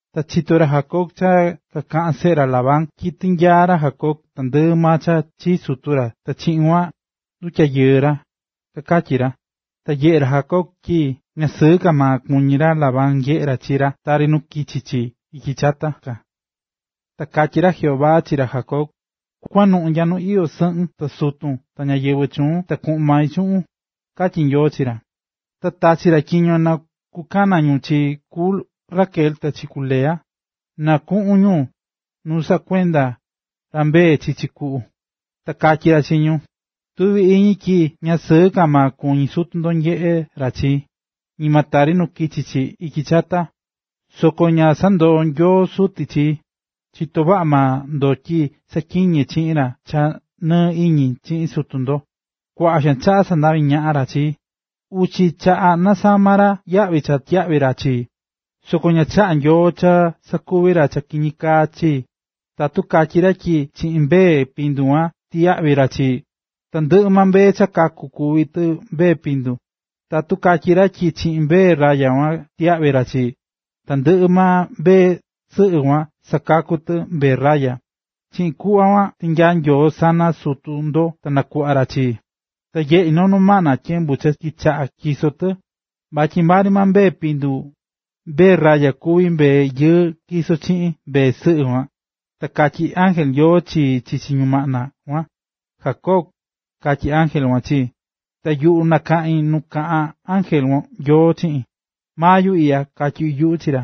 Ta chito̱ ra Jacob cha kakaꞌán seꞌe ra Labán tyi tinyaa̱ ra Jacob tandɨꞌɨ maa cha chii sutu ra ta chiꞌin kuan ndutyayɨɨ̱ ra, kakatyí ra. Ta nyeꞌé ra Jacob tyi ña sɨɨ ka maa kuñí ra Labán nyeꞌé ra chi ra tari nu kichi chi ityi chata ka. Ta katyí ra Jehová chi ra Jacob: “Kua̱nuꞌun nya nu iyó sɨꞌun ta sutun ta ñáyɨvɨ chuun ta kuꞌun mai chuꞌun”, katyí Nyoo chi ra. Ta tachi̱ ra tyiño na kukana ñu chi ku Raquel ta chi ku Lea, na kuꞌun ñu nu saꞌá kuenda ra mbee chichi kuꞌu, ta katyí ra chi ñu: ―Tuví iñi tyi ña sɨɨ ka kuñí sutu ndo nyeꞌé ra chii, ñima tari nu kichi chi ityi chata ka, soko ña sandoó Nyoo suti chii. Chitó vaꞌa maa ndo tyi saꞌatyiñé chiꞌin cha nɨɨ iñi chiꞌin sutu ndo. Kuaꞌa xaan chaꞌa sandavi ñaꞌa̱ ra chii, uchi chaꞌa nasama̱ ra yaꞌvi cha tyiyaꞌví ra chii, soko ña chaꞌá Nyoo cha sakuvi̱ ra cha kiñi kaa chii. Tatu katyí ra tyi chiꞌin mbee pindu kua tyiyaꞌvi ra chii, tandɨꞌɨ mbee cha kaku̱ kuví tɨ mbee pindu, tatu katyí ra tyi chiꞌin mbee raya kua tyiyaꞌvi ra chii, tandɨꞌɨ mbee sɨꞌɨ kuan sakakú tɨ mbee raya. Chiꞌin kuꞌva kuan tinyaa̱ Nyoo sana sutu ndo ta nakuꞌva̱ ra chii. ”Ta nyeꞌi̱ noo ñumaꞌna tyembu cha kichaꞌa̱ tyiso tɨ, vatyi maa ri maa mbee pindu, mbee raya kuví mbee yɨɨ tyisó chiꞌin mbee sɨꞌɨ kuan. Ta katyí ángel Nyoo chii chichi ñumaꞌna kuan: “Jacob”, katyí ángel kuan chii. Ta yuꞌu nakaꞌín nu kaꞌán ángel Nyoo chiꞌin: “Maa yuꞌu iꞌya”, katyí yuꞌu chi ra.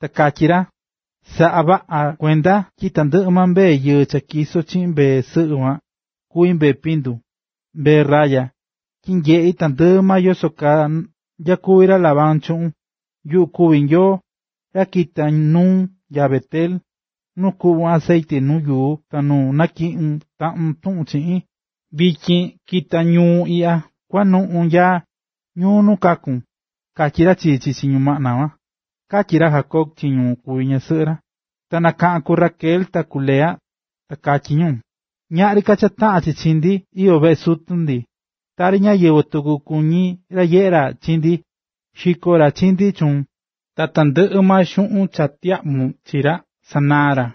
Ta katyí ra: “Sa̱ꞌa vaꞌa kuenda tyi tandɨꞌɨ maa mbee yɨɨ cha tyisó chiꞌin mbee sɨꞌɨ kuan, kuví mbee pindu, mbee raya, tyi nyeꞌí tandɨꞌɨ maa yoso kaa nyakuví ra Labán chuꞌun. Yuꞌu kuví Nyoo, ra cha kita̱ nuun nya Bet-el, nu kuꞌvu̱n acetye nuu yuu ta nu natyiꞌi̱ taꞌun tuꞌun chiꞌin. Vityin, ki̱ta ñuu iꞌya, kua̱nuꞌun nya ñuu nu kaku̱n”, katyí ra chii chichi ñumaꞌna kuan ―katyí ra Jacob chi ñu kuví ñasɨꞌɨ ra. Ta nakaꞌa̱n ku Raquel ta ku Lea, ta katyí ñu: ―Ñaꞌri ka cha taꞌán chi chi ndi iyó veꞌe sutu ndi. Tari ñáyɨvɨ tuku kuñí ra nyeꞌé ra chi ndi. Xiko̱ ra chi ndi chuun, ta tandɨꞌɨ maa xuꞌun cha tyiyaꞌvu̱n chi ra, sanaa̱ ra.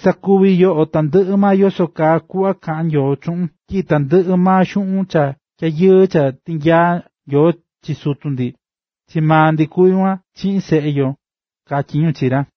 Sa̱kuvi yoꞌo tandɨꞌɨ maa yoso kaa kuꞌva kaꞌán Nyoo chuꞌun tyi tandɨꞌɨ maa xuꞌun cha tyayɨɨ cha tinyaa̱ Nyoo chi sutu ndi, chi maa ndi kuví kuan chiꞌin seꞌe yo ―katyí ñu chi ra.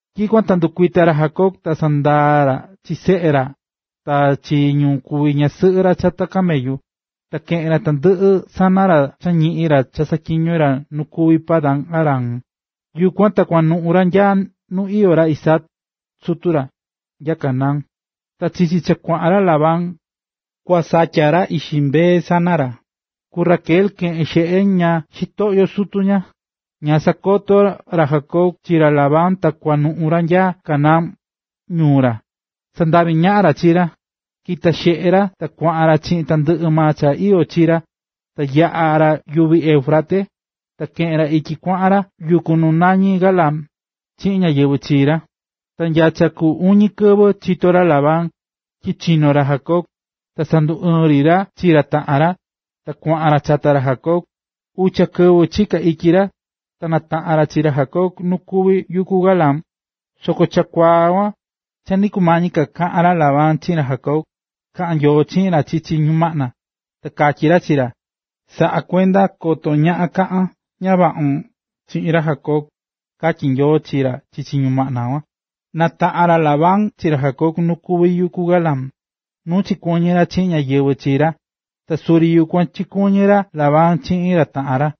Tyikuan ta ndɨkuita̱ ra Jacob ta sandaa̱ ra chi seꞌe ra ta chi ñu kuví ñasɨꞌɨ ra chata camellu. Ta keꞌe̱n ra tandɨꞌɨ sana ra cha ñiꞌi̱n ra cha saꞌatyiño̱ ra nu kuví Padan-aram. Yukuan ta kuanuꞌu̱ ra nya nu iyó ra Isaac, sutu ra, nya Canaán. Ta chichi cha kuaꞌan ra Labán, kua satya ra ixi mbee sana ra, ku Raquel chikeꞌe̱n xeꞌe ña xitoꞌyo sutu ña. Ña sakoto̱ ra Jacob chi ra Labán cha kua kunuꞌun ra nya Canaán, ñuu ra. Sandaꞌvi̱ ñaꞌan ra chi ra. Kita̱ xeꞌe ra kuaꞌan ra chiꞌin tandɨꞌɨ maa cha iyó chi ra, ta yaꞌa̱ ra yuvi Éufrates, ta keꞌe̱n ra ityi kuaꞌan ra yuku nu nañí Galaad, chiꞌin ñáyɨvɨ chii ra. Ta nya cha ku uñi kɨvɨ chito̱ ra Labán, tyi chino̱ ra Jacob. Ta sanduɨɨ̱n ri ra chi ra taꞌan ra, ta kuaꞌan ra chata ra Jacob. Ucha kɨvɨ chiká ityi ra, ta nataꞌa̱n ra chi ra Jacob nu kuví yuku Galaad. Soko chakuaa kuan cha nɨ kumañi ka kaꞌa̱n ra Labán chiꞌin ra Jacob, kaꞌa̱n Nyoo chiꞌin ra chichi ñumaꞌna, ta katyí ra chi ra: “Sa̱ꞌa kuenda koto ñaꞌan kaꞌan ña vaꞌun chiꞌin ra Jacob”, katyí Nyoo chi ra chichi ñumaꞌna kuan. Nataꞌa̱n ra Labán chi ra Jacob nu kuví yuku Galaad, nu chikuɨñɨ̱ ra chiꞌin ñáyɨvɨ chi ra, ta suri yukuan chikuɨñɨ̱ ra Labán chiꞌin ra taꞌan ra.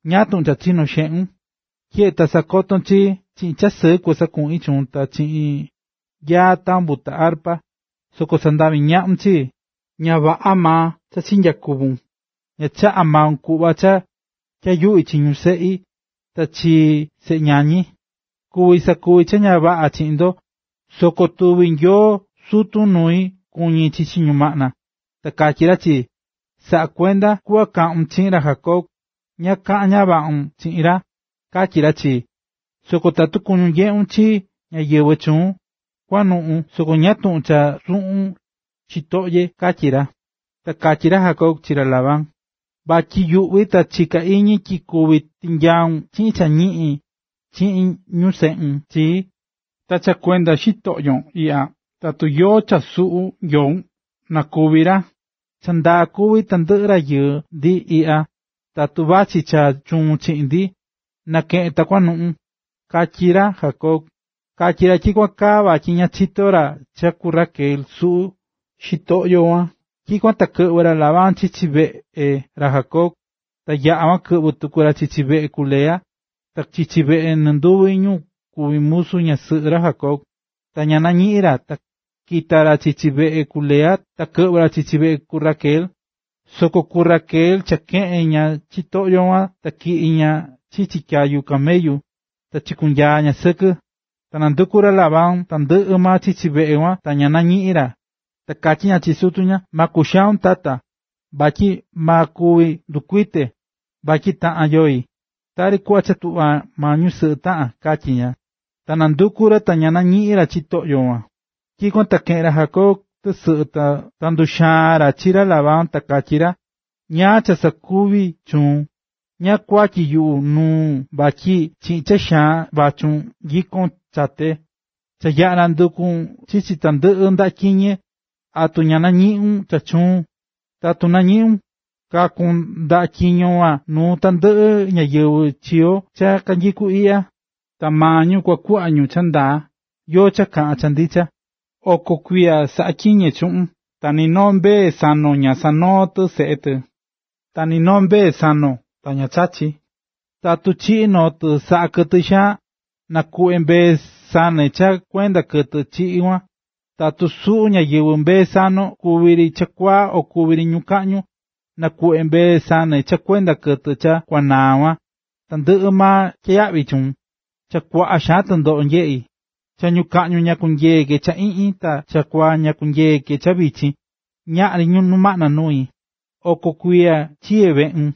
¿Ñáá tuꞌun cha chinó xeꞌun? Tyeꞌe ta sakoto̱n chii, chiꞌin cha sɨɨ kusakuꞌin chuun ta chiꞌin yaa tambu ta arpa, soko sandaꞌvi̱ ñaꞌun chii. Ña vaꞌa maa chinyakuvu̱n, ña chaꞌa̱ maun kuꞌva cha tyayuꞌi chi ñu seꞌi ta chi seꞌe ñañi. Kuví sakuvi cha ña vaꞌa chi ndo, soko tuvi̱ Nyoo sutun nui kuñi chichi ñumaꞌna, ta katyí ra chii: “Sa̱ꞌa kuenda kuꞌva kaꞌun chiꞌin ra Jacob, ñaꞌan kaꞌan ña vaꞌun chiꞌin ra”, katyí ra chii. Soko tatu cha kuñún nyeꞌun chi ñáyɨvɨ chuun, kua̱nuꞌun, soko ¿ñáá tuꞌun cha suꞌu̱n xitoꞌye? ―katyí ra. Ta katyí ra Jacob chi ra Labán: ―Vatyi yuꞌví ta chiká iñi tyi kuvi tinyaun chiꞌin cha ñiꞌin chi ñu seꞌun chii. Ta cha kuenda xitoꞌyon iꞌya, tatu yóó cha suꞌu̱ nyoun, ¡na kúvi ra! Cha ndaa kuví tandɨꞌɨ ra yañi ndi iꞌya, tatu vachí cha chuun chiꞌin ndi, na̱keꞌen ta kunuꞌun ―katyí ra Jacob. Katyí ra tyikuan kaa vatyi ña chitó ra cha ku Raquel suꞌu̱ xitoꞌyo kuan. Tyikuan ta kɨꞌvɨ̱ ra Labán chichi veꞌea ra Jacob, ta yaꞌa̱ kuan ta kɨꞌvɨ tuku ra chichi veꞌe ku Lea, ta chichi veꞌe nɨnduvi ñu kuví musu ñasɨꞌɨ ra Jacob. Ta ña nañiꞌi̱n ra. Ta kita̱ ra chichi veꞌe ku Lea, ta kɨꞌvɨ̱ ra chichi veꞌe ku Raquel. Soko ku Raquel cha keꞌe̱n ña xitoꞌyo kuan ta tyiꞌi̱ ña chichi tyayu camellu, ta chikunyaa̱ ña sɨkɨ. Ta nanduku̱ ra Labán tandɨꞌɨ chichi veꞌe kuan ta ña nañiꞌi̱n ra. Ta katyí ña chi sutu ña: ―Ma kuxaun, tata, vatyi ma kuvi ndɨkuite, vatyi taꞌan yoi, tari kuꞌva cha tuꞌva maa ñusɨꞌɨ taꞌán ―katyí ña. Ta nanduku̱ ra ta ña nañiꞌi̱n ra xitoꞌyo yukuan. Tyikuan ta keꞌe̱n ra Jacob tɨsɨꞌɨ ta nduxaa̱n ra chi ra Labán ta katyí ra: ―¿Ñáá cha sakuvi̱ chuun? ¿Ñáá kuatyi yuꞌu nuun vatyi chiꞌin cha xaan vachún nyikón chate? Cha yaꞌa̱ nanduku̱n chichi tandɨꞌɨ ndaꞌa tyiñe, ¿atu nañiꞌu̱n cha chuun? Tatu nañiꞌu̱n, kakun ndá tyiño kuan nuu tandɨꞌɨ ñáyɨvɨ chi yo cha kanyikú iꞌya, ta maa ñu kua kuꞌva ñu cha ndaa yóó cha kaꞌán cha ndicha. Oko kuiya saꞌatyiñe̱ chuꞌun, ta ni noo mbee sanon ña sanoo̱ tɨ seꞌe tɨ, ta ni noo mbee sanon ta ña chachi̱. Tatu chiꞌi̱ noo tɨ saꞌa̱ kɨtɨ xaan, nakuꞌve̱ mbee sane cha kuenda kɨtɨ chiꞌi̱ kuan, tatu suꞌu̱ ñáyɨvɨ mbee sanon kuvi ri chakuaa o kuvi ri ñukaꞌñu, nakuꞌve̱ mbee sane cha kuenda kɨtɨ cha kuanaa̱ kuan, tandɨꞌɨ maa tyiyaꞌvi̱ chuun. Cha kuaꞌa xaan tɨndoꞌo nyeꞌi̱. Cha ñukaꞌñu ña kunyeé ke cha iꞌñi, ta chakuaa ña kunyeé ke cha vichin, ñaꞌri ñumaꞌna nui. Oko kuiya chiye̱ veꞌun: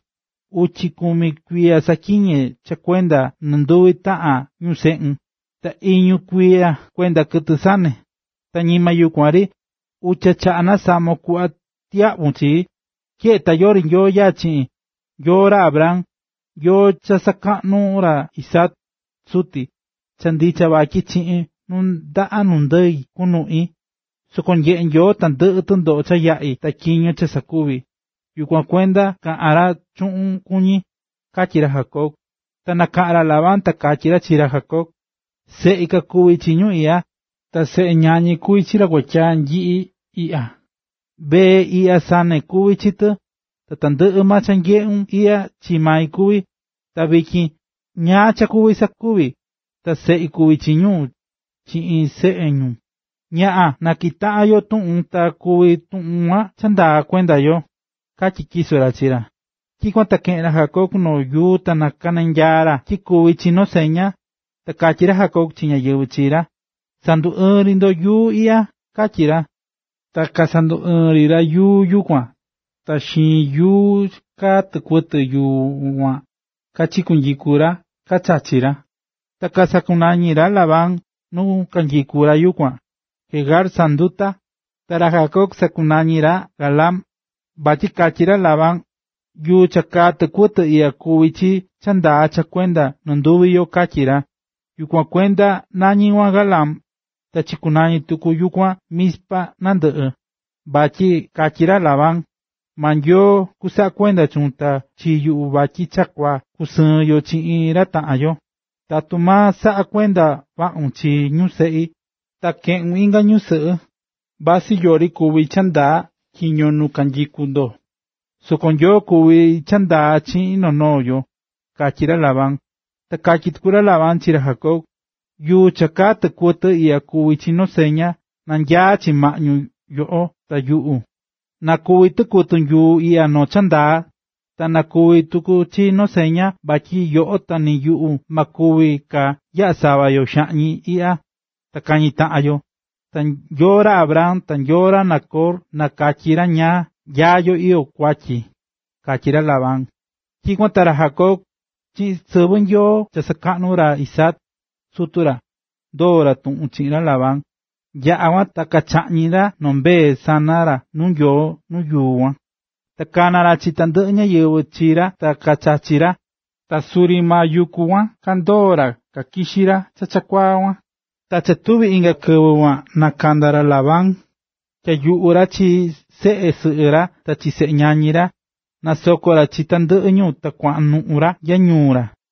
Uchi kumi kuiya saꞌatyiñe̱ cha kuenda nɨnduvi taꞌan ñu seꞌun, ta iñu kuiya kuenda kɨtɨ sane, ta ñima yukuan ri. Uchi chaꞌa̱ nasamo̱n kuꞌva tyiyaꞌvu̱n chii. Tyeꞌe ta yori Nyoo nyaá chiꞌin, Nyoo ra Abraham, Nyoo cha sakaꞌnú ra Isaac, suti, cha ndicha vatyi chiꞌin nuu ndaꞌa nu ndɨi kunuꞌi, soko nyeꞌe̱ Nyoo tandɨꞌɨ tundoꞌo cha yaꞌi̱ ta tyiño cha sakuví, yukuan kuenda kaꞌa̱n ra chuꞌun kuñi ―katyí ra Jacob. Ta nakaꞌa̱n ra Labán ta katyí ra chi ra Jacob: ―Seꞌi kakuví chi ñu iꞌya, ta seꞌe ñañi kuví chi ra kuatyaa nyiꞌi iꞌya, mbee iꞌya sane kuví chi tɨ, ta tandɨꞌɨ maa cha nyeꞌún iꞌya chii mai kuví. Ta vityin, ¿ñáá cha kuvi sakuvi?, ta seꞌi kuvi chi ñu chiꞌin seꞌe ñu. Ña̱ꞌan, ta natyiꞌi taꞌan yo tuꞌun ta kuvi tuꞌun kuan cha ndaa kuenda yo ―katyí tyiso ra chi ra. Tyikuan ta keꞌe̱n ra Jacob noo yuu ta nakananyaa̱ ra tyi kuvi chi noo seña. Ta katyí ra Jacob chi ñáyɨvɨ chi ra: ―Sanduɨɨn ri ndo yuu iꞌya―katyí ra. Ta kasanduɨɨ̱n ri ra yuu yukuan ta xiin nuu kaa tɨkuɨtɨ yuu kuan kachinyiku̱ ra kachachi̱ ra. Ta sakunañi̱ ra Labán nu chinyikú ra yukuan “Jegar Sahanduta”, ta ra Jacob sakunañi̱ ra “Galaad”. Vatyi katyí ra Labán: ―Yuu cha kaa tɨkuɨtɨ iꞌya kuví chi cha ndaa cha kuenda nɨnduvi yo ―katyí ra. Yukuan kuenda nañí kuan Galaad; ta chikunañi̱ tuku yukuan Mizpa ñandɨꞌɨ, vatyi katyí ra Labán: ―Maa Nyoo kusaꞌa kuenda chuun ta chi yuꞌu vatyi cha kua kusɨɨn yo chiꞌin ra taꞌan yo. Tatu ma saꞌa kuenda vaꞌun chi ñu seꞌi, ta keꞌun inga ñusɨꞌɨ, vasɨ yori kuví cha ndaa tyiño nu kanyikú ndo, soko Nyoo kuví cha ndaa chi noo noo yo ―katyí ra Labán. Ta katyí tuku ra Labán chi ra Jacob: ―Yuu cha kaá tɨkuɨtɨ iꞌya kuví chi noo seña nanyaá chi maꞌñu yoꞌo ta yuꞌu. Na kuvi tɨkuɨtɨ yuu iꞌya noo cha ndaa, ta na kuvi tuku chi noo seña vatyi ni yoꞌo ta ni yuꞌu ma kuvi ka yaꞌa sava yo xaꞌñi iꞌya ta kañi taꞌan yo. Ta Nyoo ra Abraham ta Nyoo ra Nacor na katyi ra nyá yo iyó kuatyi ―katyí ra Labán. Tyikuan ta ra Jacob, chiꞌin sɨvɨ Nyoo cha sakaꞌnú ra Isaac, sutu ra, ndoo̱ ra tuꞌun chiꞌin ra Labán. Yaꞌa̱ kuan, ta chaꞌñi̱ ra noo mbee sana ra nuu Nyoo nu yuku kuan, ta kana̱ ra chi tandɨꞌɨ ñáyɨvɨ chi ra ta kachachi̱ ra. Ta suri maa yuku kuan kandoo̱ ra kakixi̱ ra chakuaa kuan. Ta cha tuvi̱ inga kɨvɨ kuan nakanda̱ ra Labán, tyayuꞌu̱ ra chi seꞌe sɨꞌɨ ra ta chi seꞌe ñañi ra. Nasoko̱ ra chi tandɨꞌɨ ñu ta kuanuꞌun ra nya ñuu ra.